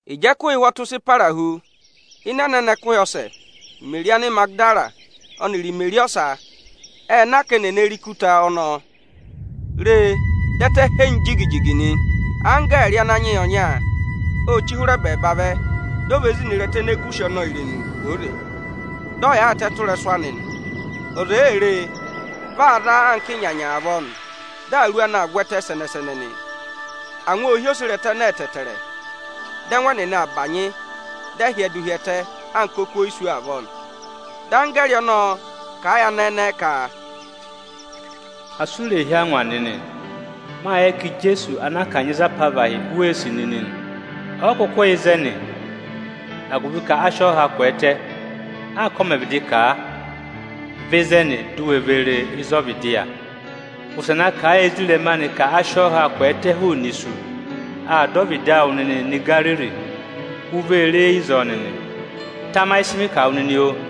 Ịjị ẹkụhị ụhwọtụ sị para hu, ịnị ẹnẹnẹ ẹkụhị ọsẹ, Imeri Anịmagịdara ọnịrị Imeri ọsa ệ na ka eni è ne re ikuta ọnọọ. Re, dị ẹtẹ henyi jigi-jigi nị. Anggẹẹrị Ananyị yị ọnya ô chí hụrẹ ẹbẹẹba vẹ, di o ve zina ịrẹta ene gù ụsị ọnọọ irenu kwooze, dị ọ yaayịtẹ tụ́ ịrẹsụ anị nị. Ọza èe re e, vị aa za anka ịnyanya avọọ nị; dị awuru anị aa vwẹtẹ sẹnẹ-sẹnẹ nị. Angwa ô hí oserẹtẹ ẹnẹẹ ẹtẹẹtẹrẹ, dị ẹngụ ẹnịnị aa bànyị, dị ẹ hyẹdụ hi ẹtẹ anka oku oyisú avọọ nị. Dị anggẹẹrị ọnọọ kà a yị anẹẹ ẹnẹẹ ka, “Asị u rè hí angwa nịnị! Mâ yẹ ka Ijeesu anaa kanyị za apavahị u wee sì nịnị nị. Ọ yị kụkụ yà ịzẹnị, agụvị ka a sị ọọ ha kwẹẹtẹ, anka ọ mẹ̀ vịdị kà a. Vẹ ịzẹnị, di u we ve re ịzọọ vịdị yà nịnị! Wụsẹ na kà a yị ezirẹma anị ka a sị ọọ ha kwẹẹtẹ hụụnị isu. Aa dọ ọvịdị awụ nịnịị nọ Igariri, u vee re e ịzọọ nịnị. Tamayị ịsị mị kà wụ nịnị, oo!”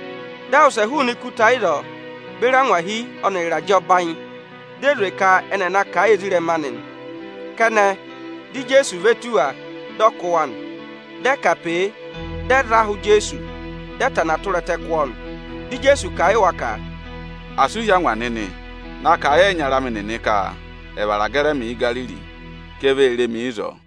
Dị ẹ wụsẹ hụụnị ikuta ịzọọ beri angwahi ọnịrị ịrajẹ ọbanyị, di e zwe ka ẹnị ẹ̀ na kà a yị ezirẹma anị nị. Kẹnẹ, dị Ijeesu ve tù wa, dị ọ kụ́ wa nị. Dị ẹ kà pe e, dị ẹ za ahụ Ijeesu, dị ẹ va ku ẹtẹ kụ́ ọọ nị. Dị Ijeesu kà a yị wa ka, “Asị u hí angwa nịnị! Na kà a yị ẹyịnyara amị nịnị ka ẹ̀ vara gẹrị ẹmị Ígariri, ka e vee re mi ịzọọ!”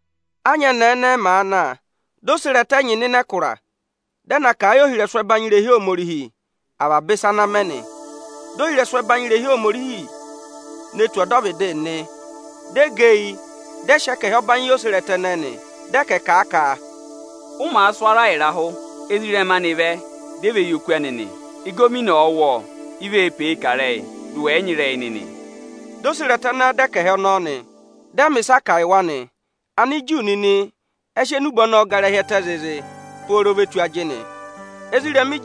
Ányẹnẹẹ ẹnẹẹ màa na, di oserẹtẹ ẹnyị nọ ịnị ẹkụra, dị ẹ na kà a yị ohirẹsụ ẹbanyị irehi Ohomorihi avaba ịsa ana mẹ nị. Dị ohirẹsụ ẹbanyị irehi Ohomorihi ne tù ọdọvịdị nịnị, dị ẹ gẹ eyi, dị ẹ sị ẹkẹhị ọbanyị yị oserẹtẹ ẹnẹẹ nị. Dị ẹ ka, “Kà a ka ụ màa sụ ara ịrahụ, ezirẹma anị vẹ, di e ve yi oku anị nị! Ịgọvọnọ ọ̀ọ wụ́ ọọ, i vee pe e kà ịrẹyị, dị ụ wẹ yị nyị ịrẹyị nịnị!” Dị oserẹtẹ ẹnẹẹ dọ ẹkẹhị ọnọọ nị; dị ẹ mẹ̀ ịsaa kà yị wa nị. Aniju nịnị ẹ sị enube ọnọọ gara hi ẹtẹ zịịzị pooro ve tù ajịnị. Ijeesu ộ sị ẹngụ zụ̀ ezirẹma anị.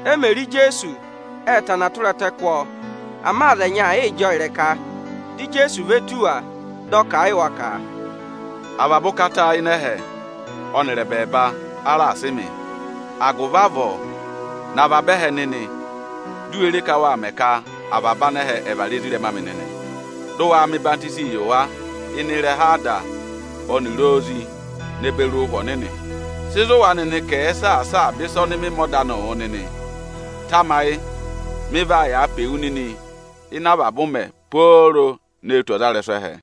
E mè re Ijeesu, ệ va ku ẹtẹ kụ́ ọọ. Ama aza ẹnyị aa yịị jị ọọ ịrẹka. Dị Ijeesu ve tù wa, dị ọ kà a yị wa ka, “A raà sị avaba ụkata ịnị ẹhẹ ọnịrị ẹbẹẹba yị mị. Agụvị avọọ, nọ avaba ẹhẹ nịnị, di u we re ka wâ mẹ ka avaba anẹhẹ ẹ̀ vara ezirẹma amị nịnị! Dị ụ waa mẹ ọyịhwenyii yị wa ịnị ịrẹha Ada ọnịrị Ozi ne beri Ụhwẹ Ọnịnị. Sị zụ̀ wa nịnị ka ẹ̀ẹ saasa avaba ịsa ọnị mị mẹ ọda anịị wụ nịnị! Tamayị, mị vaa yàa pe wu nịnị ịnị avaba ụmẹ pooro ne tù ọdịrẹma ẹhẹ.”